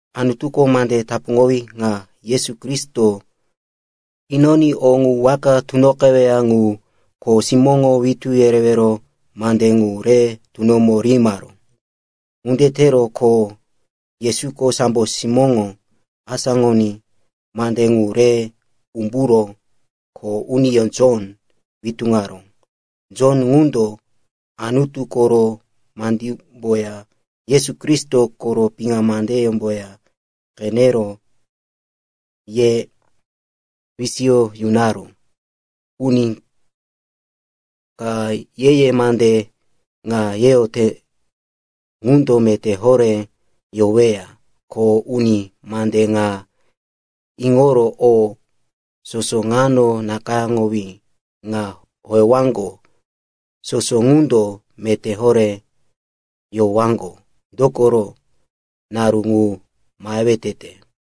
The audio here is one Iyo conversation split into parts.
Anutuko mande teapuŋowí ŋa Yesu Kristo inoní o ŋu waka tunoqeweya ŋu kho simóŋo witú yerewero mande ŋu re tunomo rihimaró. Ŋunde tero ko Yesuko sambo simóŋo asáŋoní mande ŋu re umburo kho uniyó, Jon, witúŋaró. Jon ŋundo Anutu koro mandímboya Yesu Kristo koro piŋa mandímboya qenero ye wisiyo yunaró. Uni ka ye-ye mande ŋa weyoyote ŋundo meté horé yoweya, ko uni mande ŋa iŋoro o soso ŋano nakayáŋowí ŋa howewaŋgo soso ŋundo meté horé yowaŋgo. Dokoro naru ŋu mahewe tete.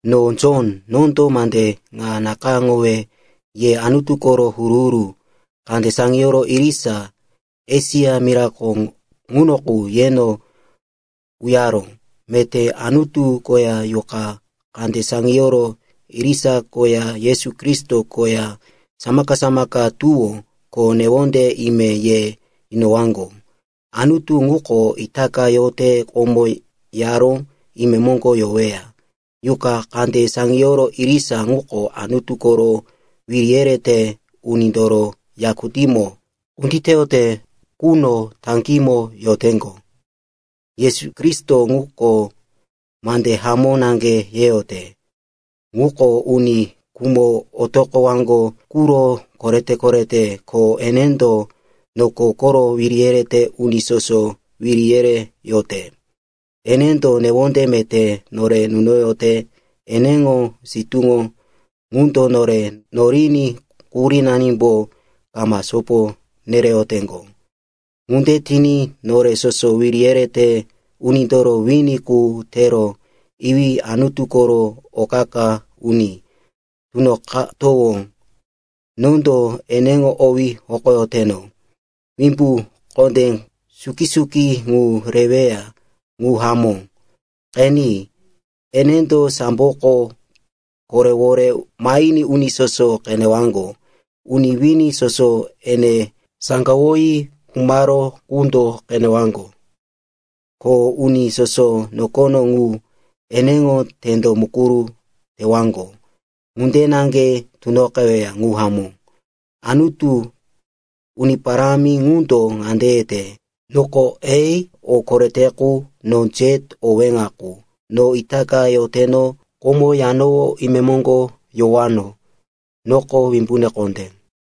No Jon, nondo mande ŋa nakayáŋowe ye Anutu koro huru-huru kande saŋiyoro irisa Esia mirako ŋuno qu, yeno uyaró. Meté Anutu koya yuqa kande saŋiyoro irisa koya Yesu Kristo koya samaka-samaka tuwó ko newonde ime ye yunowaŋgo. Anutu ŋuko itaka yote, komo yaró, imemoŋgo yoweya. Yuqa kande saŋiyoro irisa ŋuko Anutu koro wiri yerete unindoro yakutímo kunditeyote quno taŋgímo yoteŋgo. Yesu Kristo ŋuko mande hamó naŋge yeyote. Ŋuko uni khumo otoqowaŋgo quro korete-korete. Ko enendo noko koro wiri yerete uni soso wiri yereyote. Enendo newonde meté nore nunoyote. Eneŋo sitúŋo ŋundo nore noriní quhurínanimbo kama sopo nereyoteŋgo. Ŋunde tiní nore soso wiri yerete unindoro wini qu tero iwí Anutu koro o qa-qa uni tunoqatowó. Nondo eneŋo owí hokoyoteno. Wimbu kondé suki-suki ŋu reweya. Ŋu hamó. Qeni, enendo samboko koporéwore mahiní uni soso qenewaŋgo. Uni wini soso ene saŋgawoyi khumaró qundo qenewaŋgo, ko uni soso nokono qu eneŋo tendo mukuru tewaŋgo. Ŋunde naŋge tunoqeweya. Ŋu hamó. Anutu, Uni Parámi ŋundo ŋande yete, “Noko A, o korete qu, noko Z, o weŋa qu. No itaka yoteno, komo yanowó, imemoŋgo yowano. Noko Wimbune Kondé.”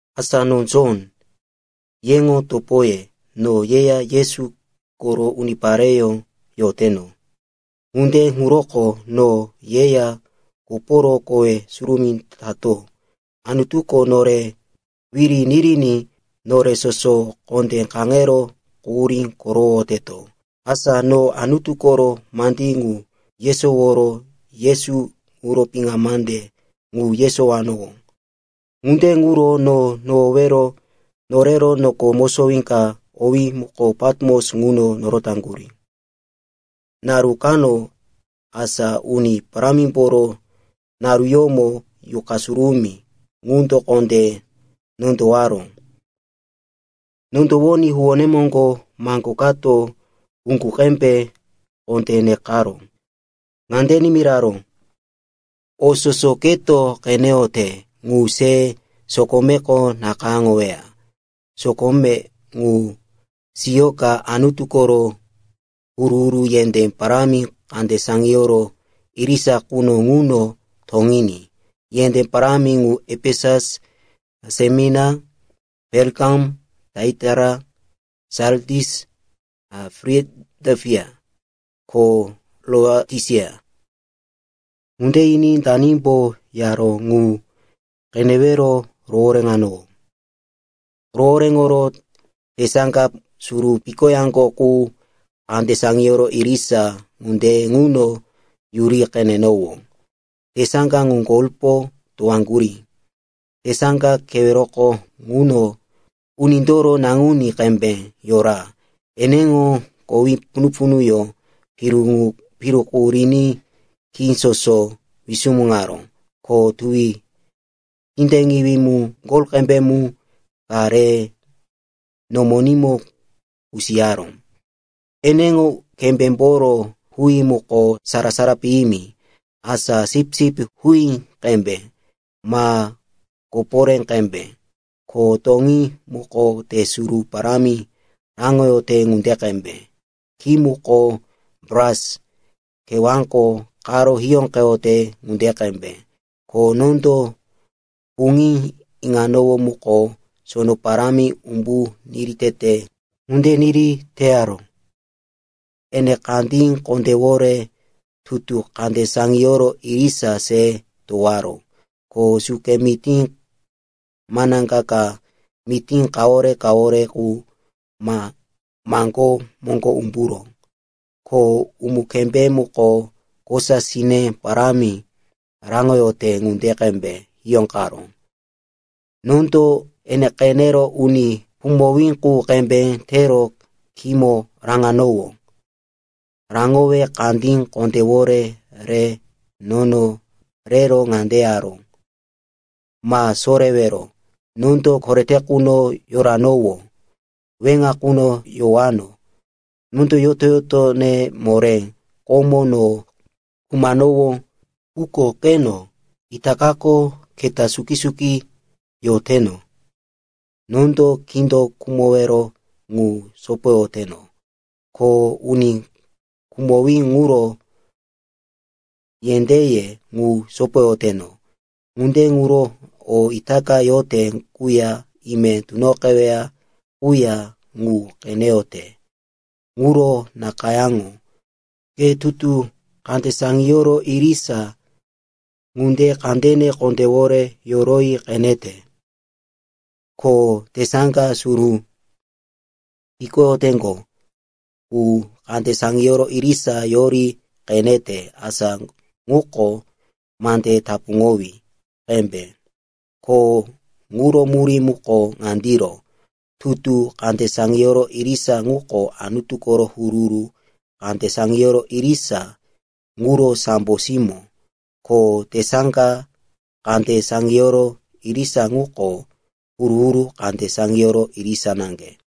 Asa no Jon, yeŋo topoye. No yeya Yesu koro unipareyó yoteto. Ŋunde ŋuroko no yeya koporo kowe surumí tato Anutuko nore wiri niriní nore soso kondé kaŋero quhurí korowoyoteto. Asa no Anutu koro mandí ŋu yesoworo Yesu ŋuro piŋa mande ŋu yesowanowó. Ŋunde ŋuro no nohowero norero noko mosowí ka owí muko Patimos ŋuno norotaŋgurí. Naru kano, asa Uni Parámimboro naruyómo, Yuqa Surumí ŋundo kondé nondowaró. Nondowoní huwóne moŋgo maŋgo kato uŋgu qembe kondé nekaró. Ŋande nimiraró, “O soso keto qeneyote ŋu se sokomeko nakayáŋoya sokome ŋu siyoka Anutu koro huru-huru yendé parámi kande saŋiyoro irisa quno ŋuno toŋiní. Yendé parámi ŋu Efesus, Semerina, Perikamum, Taiataira, Sardis, Filadelfia, ko Laotisia.” Ŋunde yiní danimbo yaró ŋu qenewero rohoréŋanowó. Rohoréŋoro tesaŋga suru pikoyaŋgo qu kande saŋiyoro irisa ŋunde ŋuno yuri qenenowó. Tesaŋga ŋu golpo towaŋgurí. Tesaŋga keweroko ŋuno uni ka unindoro naŋuní qembe yora. Eneŋo kowe punu-punuyó piru qu riní khí soso wisumuŋaró. Ko tuwi tindeŋiwí mu, gol qembe mu, ka re nomonímo kusiyaró. Eneŋo kembémboro huí muko sara-sara piyimi, asa sipsip huí qembe ma koporé qembe. Ko toŋí muko te suru parámi raŋoyote ŋunde qembe. Khí muko bras kewáko qaro hiyóqeyote ŋunde qembe. Ko nondo puŋí iŋanowó muko sono parámi umbu niri tete ŋunde niri teyaró. Ene kandí kondéwore tutu kande saŋiyoro irisa se towaró. Ko suke mití manaŋga ka, mití kawore-kawore qu, maŋgó moŋgo umburó. Ko umu-kembé muko kosa sine parámi raŋoyote ŋunde qembe hiyóqeyaró. Nondo ene qenero uni khumowí qu qembe tero khímo rokaráŋo umbu raŋanowó. Raŋowe kandí kondéwore re nono rero ŋande yaró, “Ma sorewero. Nondo korete quno yoranowó, weŋa quno yowano. Nondo yoto-yotone moré. Komo no khumanowó, quko qeno, itakako keta suki-suki yoteno. Nondo kindo khumowero ŋu sopoyoteno, ko uni khumowí ŋuro yendéye, ŋu sopoyoteno. “Ŋunde ŋuro o itaka yote quya ime tunoqeweya quya ŋu qeneyote ŋuro nakayáŋo. Ke tutu kande saŋiyoro irisa ŋunde kandene kondéwore yoroyi qenete, ko tesaŋga suru pikoyaŋgo qu kande saŋiyoro irisa yoroyi qenete. Asa ŋuko mande tapuŋowí qembe, ko ŋuro murí muko ŋandiro. Tutu kande saŋiyoro irisa ŋuko Anutu koro huru-huru kande saŋiyoro irisa ŋuro sambo simó. Ko tesaŋga kande saŋiyoro irisa ŋuko huru-huru kande saŋiyoro irisa naŋge.